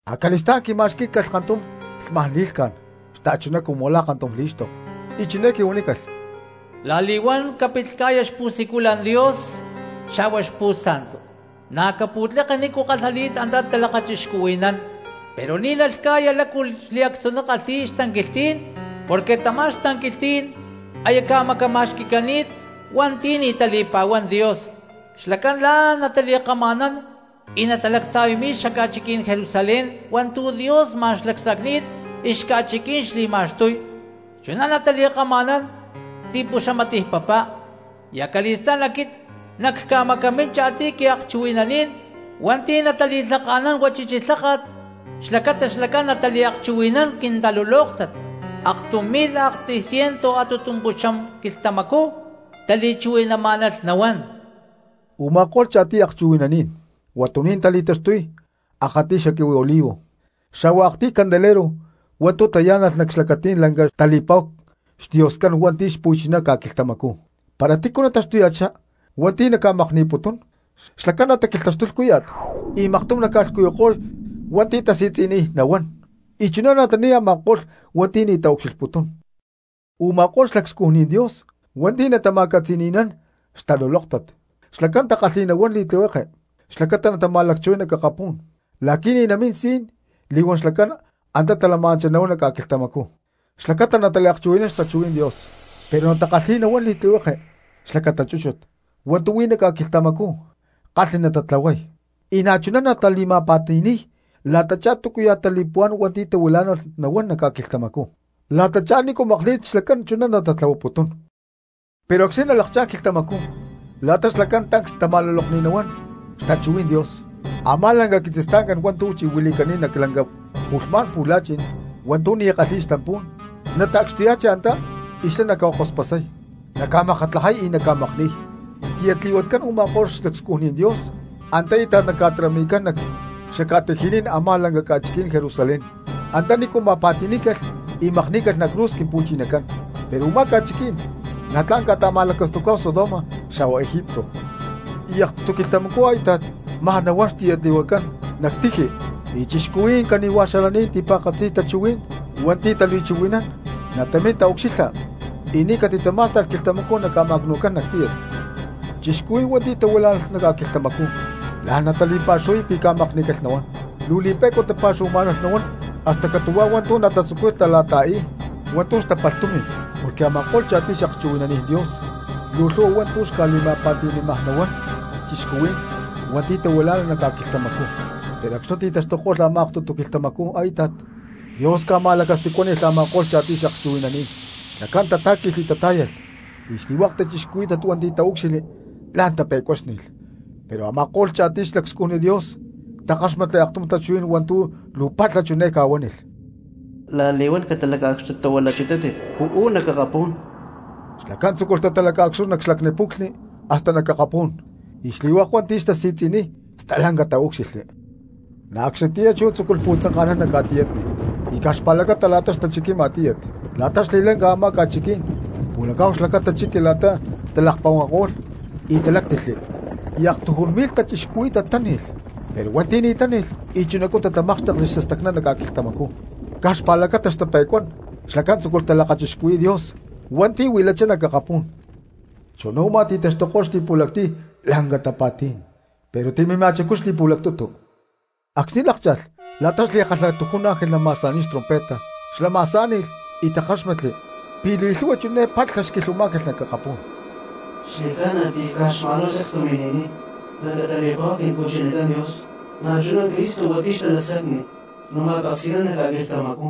Acali̠stá̠n quima̠xquí̠calh kantum lhma̠n li̠lhca̠n xta̠chuná cumu la̠ kantum lí̠xtoko, y chiné quihuanícalh: —La̠li̠huán capit lhca̠ya xpu̠siculan Dios xa̠hua xaltar, na̠ caca̠pu̠tleke nícu kalhali̠t antá talakachixcuhui̠nán. Pero ni̠ nalhca̠ya lácu xliactzuná kalhi̠y xatanquilhtí̠n, porque tamá xatanquilhtí̠n aya ca̠macama̠xqui̠cani̠t hua̠nti̠ ni̠ tali̠pa̠huán Dios, xlacán la̠n natali̠kama̠nán y natalacta̠yami̠y cxaca̠chiquí̠n Jerusalén hua̠ntu̠ Dios ma̠n xlacsacni̠t y xca̠chiquí̠n xli̠ma̠xtúy, chuná natali̠kama̠nán ti̠puxamatiy papá. Y acali̠stá̠n aquit nacca̠macamín cha̠tiy quiakchuhui̠nanín hua̠nti̠ natali̠lhaka̠nán huachichi lháka̠t xlacata xlacán nataliakchuhui̠nán quintalulóktat, aktum mi̠lh aktiy cientu a̠tutumpuxam quilhtamacú tali̠chuhui̠namá̠nalh nahuán. Uma̠kó̠lh cha̠tiy akchuhui̠naní̠n huatuní̠n tali̠taxtuy akatiy xaquihui olivo xa̠hua aktiy candelero hua̠ntu̠ tayá̠nalh nac xlacatí̠n lanca tali̠pa̠hu xDioscán hua̠nti̠ xpu̠chiná ca̠quilhtamacú. Para tícu nataxtuya̠chá hua̠nti̠ para naca̠makni̠putún, xlacán nataquilhtaxtuy lhcúya̠t y maktum naca̠lhcuyuko̠y hua̠nti̠ tasi̠tzi̠niy nahuán, y chuná natani̠y a̠ma̠ko̠lh hua̠nti̠ ni̠ nataucxilhputún. Uma̠kó̠lh xlacscujni Dios hua̠nti̠ natama̠catzi̠ni̠nán xtalulóktat, xlacán takalhi̠y nahuán li̠tlihueke xlacata natama̠lacchuhuay nac akapú̠n la̠qui̠ ni̠ namín si̠n li̠huán xlacán antá talama̠nanchá nahuán nac ca̠quilhtamacú xlacata nataliakchuhui̠nán xtachuhuí̠n Dios, pero na̠ takalhi̠y nahuán li̠tlihueke xlacata chúchut hua̠ntu̠ huí nac ca̠quilhtamacú tla̠n kalhni natatlahuay, y na̠chuná natali̠ma̠pa̠ti̠ni̠y la̠tachá túcuya̠ tali̠puhuá̠n hua̠nti̠ tahuilá̠nalh nahuán nac ca̠quilhtamacú, la̠tachá nícu makli̠t xlacán chuná natatlahuaputún. Pero acxni̠ nalakchá̠n quilhtamacú la̠ta xlacán tancs tama̠lulokni̠t nahuán xtachuhuí̠n Dios, a̠má lanca quitzistancán hua̠ntu̠ chi̠huili̠cani̠t nac lanca pu̠lhmá̠n pu̠la̠chi̠n hua̠ntu̠ ni̠ kalhi̠y xtampú̠n nata̠cxtuya̠chi antá y xlá naca̠kospasay, naca̠makatlajay y naca̠makni̠y. Xtiyatli̠huacán u̠ma̠ko̠lh xlacscujni Dios antá íta̠t naca̠tarami̠cán nac xaca̠tiji̠ní̠n a̠má lanca ca̠chiquí̠n Jerusalén antanícu ma̠pa̠ti̠ní̠calh y makní̠calh nac cruz Quimpu̠chinacán. Pero u̠má ca̠chiquí̠n na̠ tla̠n ca̠ta̠ma̠lacastucá̠hu Sodoma xa̠hua Egipto. Y aktutu quilhtamacú a̠íta̠t maj nahuán xtiyatli̠huacán nac tiji, y cristianos cani̠huaj xalaní̠n y ti̠pa̠katzi tachuhuí̠n hua̠ntu̠ tali̠chuhui̠nán natamín taucxilha, y ni̠ catitamá̠sta̠lh quilhtamacú naca̠ma̠cnu̠cán nac tíyat. Cristianos hua̠nti̠ tahuilá̠nalh nac ca̠quilhtamacú la̠n natali̠pa̠xuhuay pi̠ ca̠makní̠calh nahuán, luu li̠pe̠cua tapa̠xuhuamá̠nalh nahuán hasta catu̠huá hua̠ntu̠ natatzucuy la̠ta̠i̠y hua̠ntu̠ xtapalh tumi̠n, porque a̠ma̠ko̠lh cha̠tiy xakchuhui̠naní̠n Dios luu lhu̠hua hua̠ntu̠ xca̠li̠ma̠pa̠ti̠ní̠maj nahuán cristianos hua̠nti̠ tahuilá̠nalh nac ca̠quilhtamacú. Pero acxni̠ ti̠taxtuko̠lh a̠má aktutu quilhtamacú a̠íta̠t, Dios ca̠ma̠lacastacuáni̠lh a̠ma̠ko̠lh cha̠tiy xakchuhui̠naní̠n, xlacán tatá̠qui̠lh y tatá̠yalh, y xli̠hua̠k cristianos hua̠nti̠ taúcxilhli la̠n tape̠cuáxni̠lh. Pero a̠ma̠ko̠lh cha̠tiy xlacscujni Dios takáxmatli aktum tachuhuí̠n hua̠ntu̠ luu palha chiné ca̠huánilh: —¡La̠li̠huán catalaca̠cxtuchitátit uú nac akapú̠n! Xlacán tzúculh tatalaca̠cxtuy nac xlacni puclhni hasta nac akapú̠n, y xli̠hua̠k hua̠nti̠ xtasi̠tzi̠niy stalanca taúcxilhli. Na̠ acxnitiyá chú tzúculh pu̠tzanka̠nán nac ca̠tiyatni y caj xpa̠lacata la̠ta xtachiquima tíyat, la̠ta xli̠lanca a̠má ca̠chiquí̠n pu̠laccá̠hu xlacata chiqui la̠ta talakponkako̠lh y taláctilhli, y aktujún mi̠lh cristianos táni̠lh; pero hua̠nti̠ ni̠ táni̠lh y chunacú tatamákxtekli xastacná nac ca̠quilhtamacú, caj xpa̠lacata xtape̠cuacán xlacán tzúculh talakachixcuhui̠y Dios hua̠nti̠ huilachá nac akapú̠n. Chuná u̠má ti̠taxtuko̠lh xli̠pu̠lactiy lanca tapa̠tí̠n, pero timimajcú xli̠pu̠lactutu. Acxni̠ lákcha̠lh la̠ta xli̠kalhatujún ángel nama̠sa̠ni̠y xtrompeta, xlá ma̠sá̠ni̠lh y takáxmatli pi̠ li̠lhu̠hua chiné palha xquilhuamá̠calh nac akapú̠n: ¡Xli̠ca̠na pi̠ caj xma̠n huá sacstu mini̠niy lanca tali̠pa̠hu Quimpu̠chinacán Dios, na̠chuná Cristo hua̠nti̠ xtalacsacni natama̠peksi̠nán nac ca̠quilhtamacú!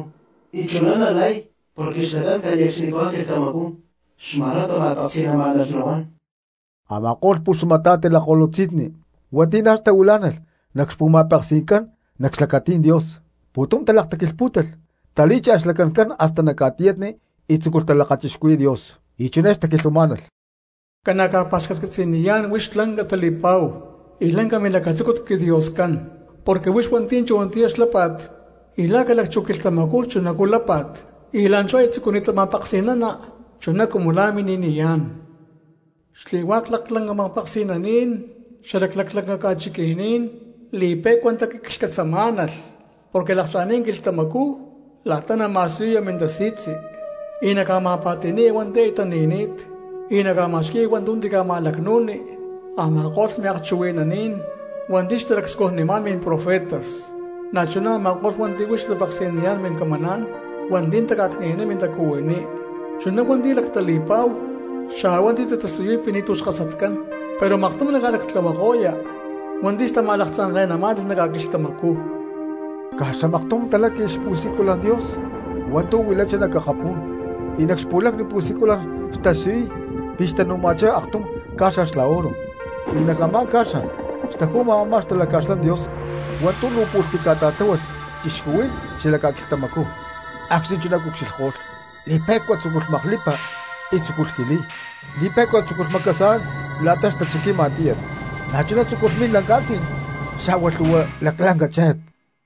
Y chuná nalay porque xlacán cane̠cxnicahuá quilhtamacú xma̠n huá tama̠peksi̠namá̠nalh nahuán. Ama̠ko̠lh puxamata̠ti lakko̠lutzi̠nni hua̠nti̠ na̠ tahuilá̠nalh nac xpu̠ma̠peksi̠ncán nac xlacatí̠n Dios, pu̠tum talakataquilhpú̠talh, talí̠cha̠lh xlacancán hasta nac ca̠tiyatni y tzúculh talakachixcuhui̠y Dios, y chiné xtaquilhuamá̠nalh: Ca̠na cca̠pa̠xcatcatzi̠niyá̠n huix lanca tali̠pa̠hu y lanca milacatzúcut quiDioscán, porque huix hua̠nti̠ chunatiyá xlápa̠t y la̠ ca̠lacchú quilhtamacú chunacú lápa̠t, y la̠nchú aya tzucuni̠ta ma̠peksi̠nana chuná cumu la̠ mini̠niyá̠n. Xli̠hua̠k laclanca ma̠peksi̠naní̠n xalac laclanca ca̠chiqui̠ní̠n li̠pe̠cua taquiclhcatzamá̠nalh porque lakcha̠ni̠t quilhtamacú la̠ta nama̠siyuya mintasi̠tzi, y naca̠ma̠pa̠ti̠ni̠ya hua̠nti̠ aya tani̠ni̠t; y naca̠ma̠xqui̠ya hua̠ntu̠ tica̠ma̠lacnu̠ni a̠ma̠ko̠lh miakchuhui̠naní̠n hua̠nti̠ xtalacscujnimá̠n mimprofetas, na̠chuná a̠ma̠ko̠lh hua̠nti̠ huix tatapeksi̠niyá̠n mincamaná̠n hua̠nti̠ taca̠cni̠naniy mintacuhuiní, chuná hua̠nti̠ lactali̠pa̠hu xa̠hua hua̠nti̠ tatasiyuy pi̠ ni̠tu̠ xkasatcán; pero maktum naca̠lactlahuaya̠huako̠ya hua̠nti̠ xtama̠laktzanke̠namá̠nalh nac ca̠quilhtamacú. Caj xamaktum taláqui̠lh xpu̠siculan Dios hua̠ntu̠ huilachá nac akapú̠n y nac xpu̠lacni pu̠siculan xtasiyuy pi̠ xtanu̠ma̠chá aktum ca̠xa xla oro y nac a̠má ca̠xa xtaju̠ma a̠má xtalaca̠xlán Dios hua̠ntu̠ luu pu̠lh tica̠ta̠tláhualh cristianos xalac ca̠quilhtamacú. Acxni̠ chuná cucxilhko̠lh li̠pe̠cua tzúculh maklipa y tzúculh jiliy, li̠pe̠cua tzúculh macasa̠nán la̠ta xtachiquima tíyat, na̠chuná tzúculh min lanca si̠n xa̠hua lhu̠hua laclanca chéje̠t.